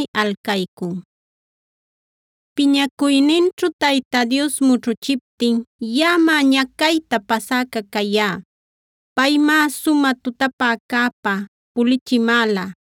Alef Piñacuyninćhu Tayta Dios mućhuchiptin yaꞌamá ñacayta pasäca cayá. Paymá sumä tutapäcäpa pulichimäla;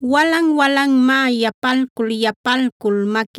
Walan-walanmá yapalcul-yapalcul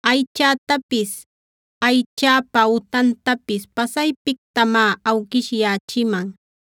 Aychätapis, aychäpa utantapis pasaypictamá awquishyächiman;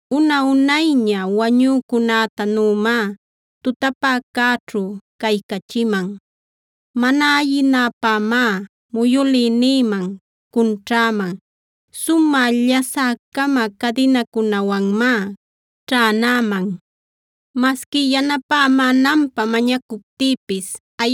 Una-unayña wañücunätanümá tutapäcäćhu caycachiman.e Mana ayinäpämá muyülïnïman cunćhäman;f sumä llasä-cama cadinacunawanmá ćhänäman. Masqui yanapämänanpä mañacuptïpis,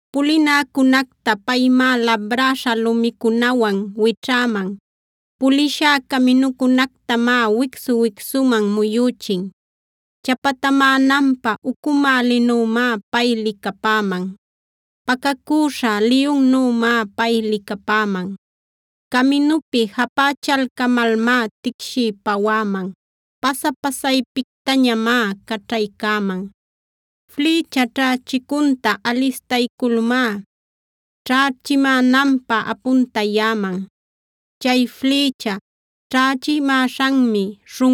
Pulinäcunacta paymá labräśha lumicunawan wićhäman; pulishá caminücunactamá wicsu-wicsuman muyüchin. Chapatamänanpä ucumälinümá pay licapäman;h pacacüśha liyunnümá pay licapäman. Caminupi japächalcamalmá ticshiy pawäman; pasa-pasaypictañamá caćhaycäman. Flïcha ćhächicunta alistayculmá ćhächimänanpä apuntayäman. Chay flïcha ćhächimäśhanmi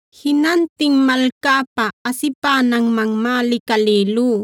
Jinantin malcäpä asipänanmanmá licalïlú;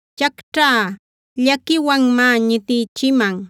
Ćhacćhä llaquiwanmá ñitïchiman;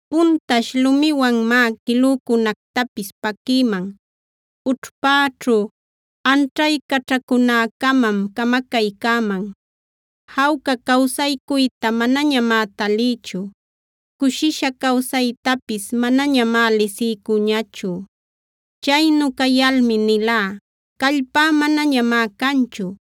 Puntash lumiwanmá quilücunactapis paquïman; ućhpäćhu anćhaycaćhacunäcamam camacaycäman. Jawca cawsaycuyta manañamá talïchu; cushisha cawsaytapis manañamá lisiycüñachu. Chaynu cayalmi nilá: “Callpá manañamá canchu.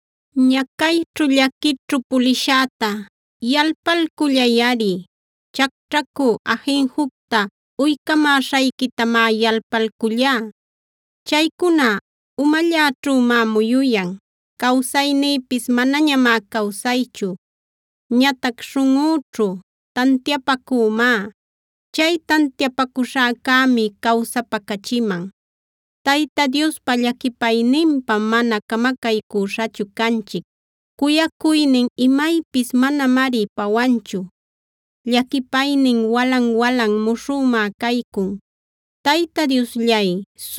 Ñacayćhu, llaquićhu pulishäta yalpalcullayꞌari; ćhacćhacu ajinjucta uycamäśhayquitamá yalpalcullá. Chaycuna umalläćhümá muyuyan; cawsaynïpis manañamá cawsaychu. Ñatac śhunꞌüćhu tantiapacümá; chay tantiapacuśhäcämi cawsapacachiman. Tayta Diospa llaquipayninpam mana camacaycuśhachu canchic; cuyacuynin imaypis manamari pawanchu. Llaquipaynin walan-walan muśhümá caycun; Tayta Diosllay,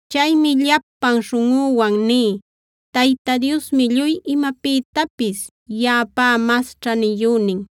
Chaymi llapan śhunꞌüwan ní: “Tayta Diosmi lluy imapïtapis yaꞌapá mas ćhaniyünin.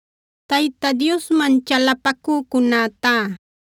Tayta Diosman chalapacücunätá,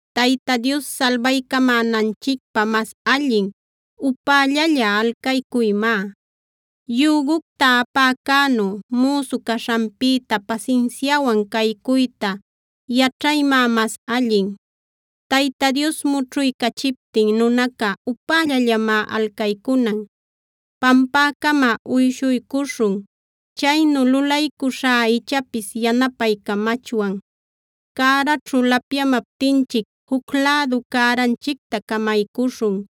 Tayta Dios salbaycamänanchicpä mas allin, upällalla alcaycuymá. Yügucta apäcänu müsu caśhanpïta pasinsiawan caycuyta yaćhaymá mas allin. Tayta Dios mućhuycachiptin nunaca upällallamá alcaycunan. Pampäcama uyshuycuśhun; chaynu lulaycuśhá ichapis yanapaycamachwan. Cäraćhu lapyamaptinchic, juc lädu cäranchicta camaycuśhun;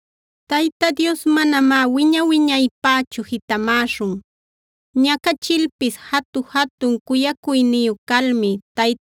Tayta Dios manamá wiña-wiñaypächu jitämäśhun. Ñacachilpis jatu-jatun cuyacuyniyu calmi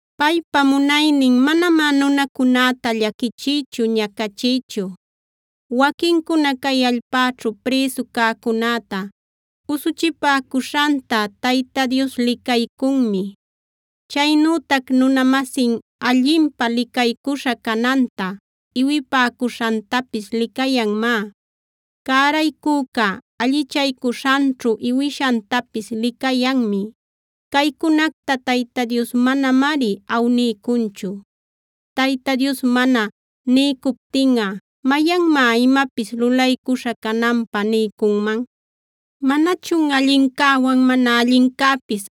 Paypa munaynin manamá nunacunäta llaquichiychu, ñacachiychu. Waquincuna cay allpäćhu prïsu cäcunäta usuchipäcuśhanta Tayta Dios licaycunmi. Chaynütac nuna-masin allinpä licaycuśha cananta iwipäcuśhantapis licayanmá. Cäraycüca allichaycuśhanćhu iwishantapis licayanmi; caycunacta Tayta Dios manamari awniycunchu. Tayta Dios mana niycuptinꞌa, ¿mayanmá imapis lulaycuśhä cananpä niycunman? ¿Manachun allincäwan mana allincäpis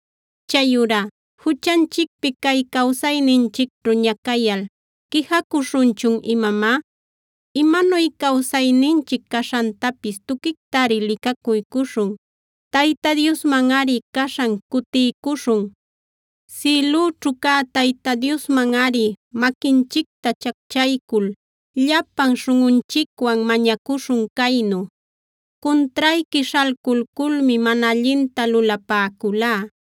Chayurá juchanchicpi cay cawsayninchicćhu ñacayal, ¿quijacuśhunchun imamá? Imanuy cawsayninchic caśhantapis tuquictari licacuycuśhun; Tayta Diosmanꞌari caśhan cutiycuśhun. Sïlüćhu cä Tayta Diosmanꞌari maquinchicta chacchaycul llapan śhunꞌunchicwan mañacuśhun caynu: “Cuntrayqui śhalculculmi mana allinta lulapäculá.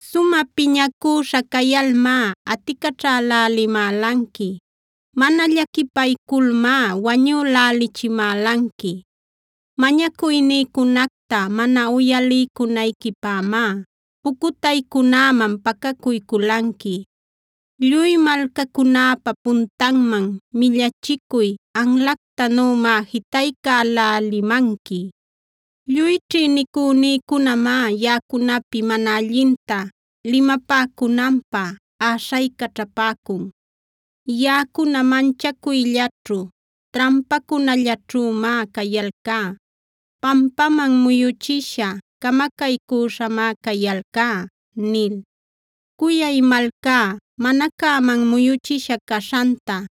“Sumä piñacüśha cayalmá aticaćhälälimälanqui; mana llaquipayculmá wañülächimälanqui. Mañacuynïcunacta mana uyaliycunayquipämá, pucutaycunäman pacacuyculanqui. Lluy malcacunäpa puntanman millachicuy anlactanümá jitaycälälimanqui. “Lluy ćhïnicünïcunamá yaꞌacunapi mana allinta limapäcunanpä äśhaycaćhapäcun. Yaꞌacuna manchacuyllaćhu, trampacunallaćhümá cayalcá; pampaman muyüchisha, camacaycüśhamá cayalcá” nil. Cuyay malcá mana cäman muyüchisha caśhanta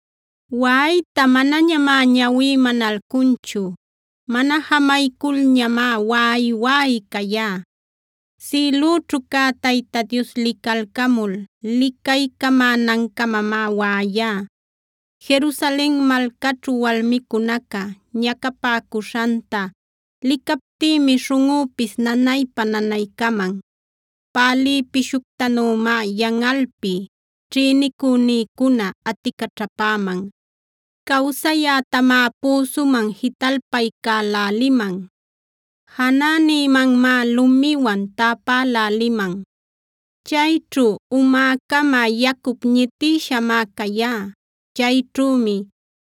Waꞌayta manañamá ñawí manalcunchu; mana jamayculñamá waꞌay-waꞌay cayá. Sïlüćhu cä Tayta Dios licalcamul licaycamänancamamá waꞌayá. Jerusalen malcaćhu walmicunaca ñacapäcuśhanta licaptïmi śhunꞌüpis nanaypa-nanaycaman. Pälï pishuctanümá yanꞌalpi ćhïnicünïcuna aticaćhapäman. Cawsayätamá püsuman jitalpaycäläliman; janänïmanmá lumiwan täpäläliman. Chayćhu umäcama yacup ñitïshamá cayá; chayćhümi: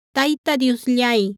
Tayta Diosllay,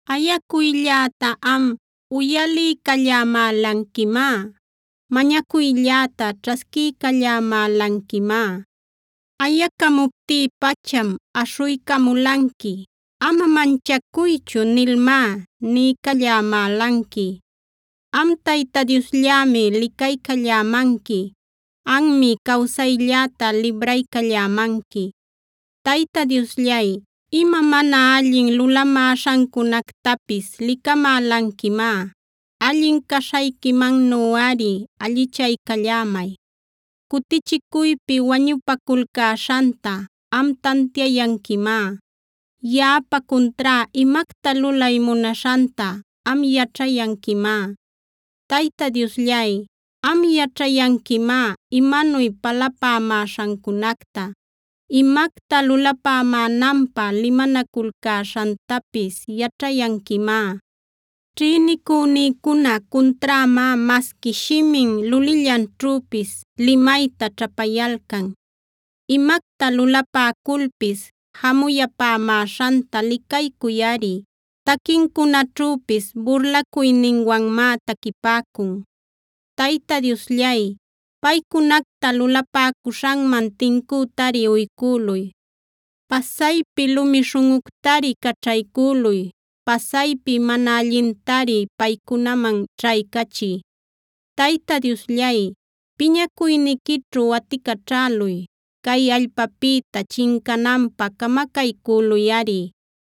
Ayacuylläta am, uyaliycallämälanquimá; mañacuylläta ćhasquiycallämälanquimá. Ayacamuptí-pacham aśhuycamulanqui. “Ama manchacuychu” nilmá niycallämälanqui. Am Tayta Diosllämi licaycallämanqui; anmi, cawsaylläta libraycallämanqui. Tayta Diosllay, ima mana allin lulamäśhancunactapis licamälanquimá; allin caśhayquimannuꞌari allichaycallämay. Cutichicuypi wañupaculcäśhanta am tantiayanquimá; yaꞌapa cuntrá imacta lulay munaśhanta am yaćhayanquimá. Tayta Diosllay, am yaćhayanquimá imanuy palapämäśhancunacta; imacta lulapämänanpä limanaculcäśhantapis yaćhayanquimá. Ćhïnicünïcuna cunträmá masqui shimin lulillanćhüpis limayta ćhapayalcan. Imacta lulapäculpis jamuyapämäśhanta licaycuyꞌari; taquincunaćhüpis burlacuyninwanmá taquipäcun. Tayta Diosllay, paycunacta lulapäcuśhanman tincütari uycüluy. Pasaypi lumi śhunꞌuctari caćhaycüluy; pasaypi mana allintari paycunaman ćhaycachiy. Tayta Diosllay, piñacuyniquićhu aticaćhäluy; cay allpäpïta chincananpä camacaycüluyꞌari.